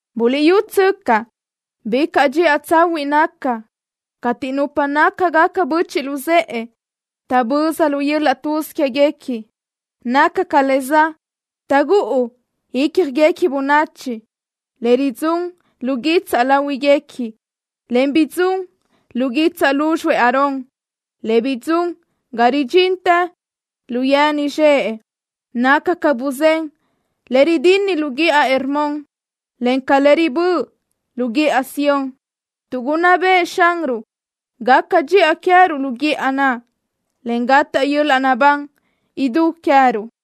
Buliʼyútsöcaʼ: ¡Bicaʼ dxiʼa tsahuiʼ naca cateʼ nupa nácagaca böchiʼ luzëʼe taʼböza lu yöl-laʼ tuz quéguequi! Naca ca le za taʼgúʼu ícjaguequi bönachi, le ridzún lu guitsaʼ láhuiguequi, en bidzún lu guitsaʼ lúzxuëʼ Aarón, le bidzún ga ridxintë lu yeni zxëʼ. Naca ca buzén le ridinni lu guíʼa Hermón, en ca le riböʼa lu guíʼa Sión, tuʼ gunná bëʼë Xanruʼ gaca dxiʼa queëruʼ lu guíʼa naʼ, en gataʼ yöl-laʼ naʼbán idú queëruʼ.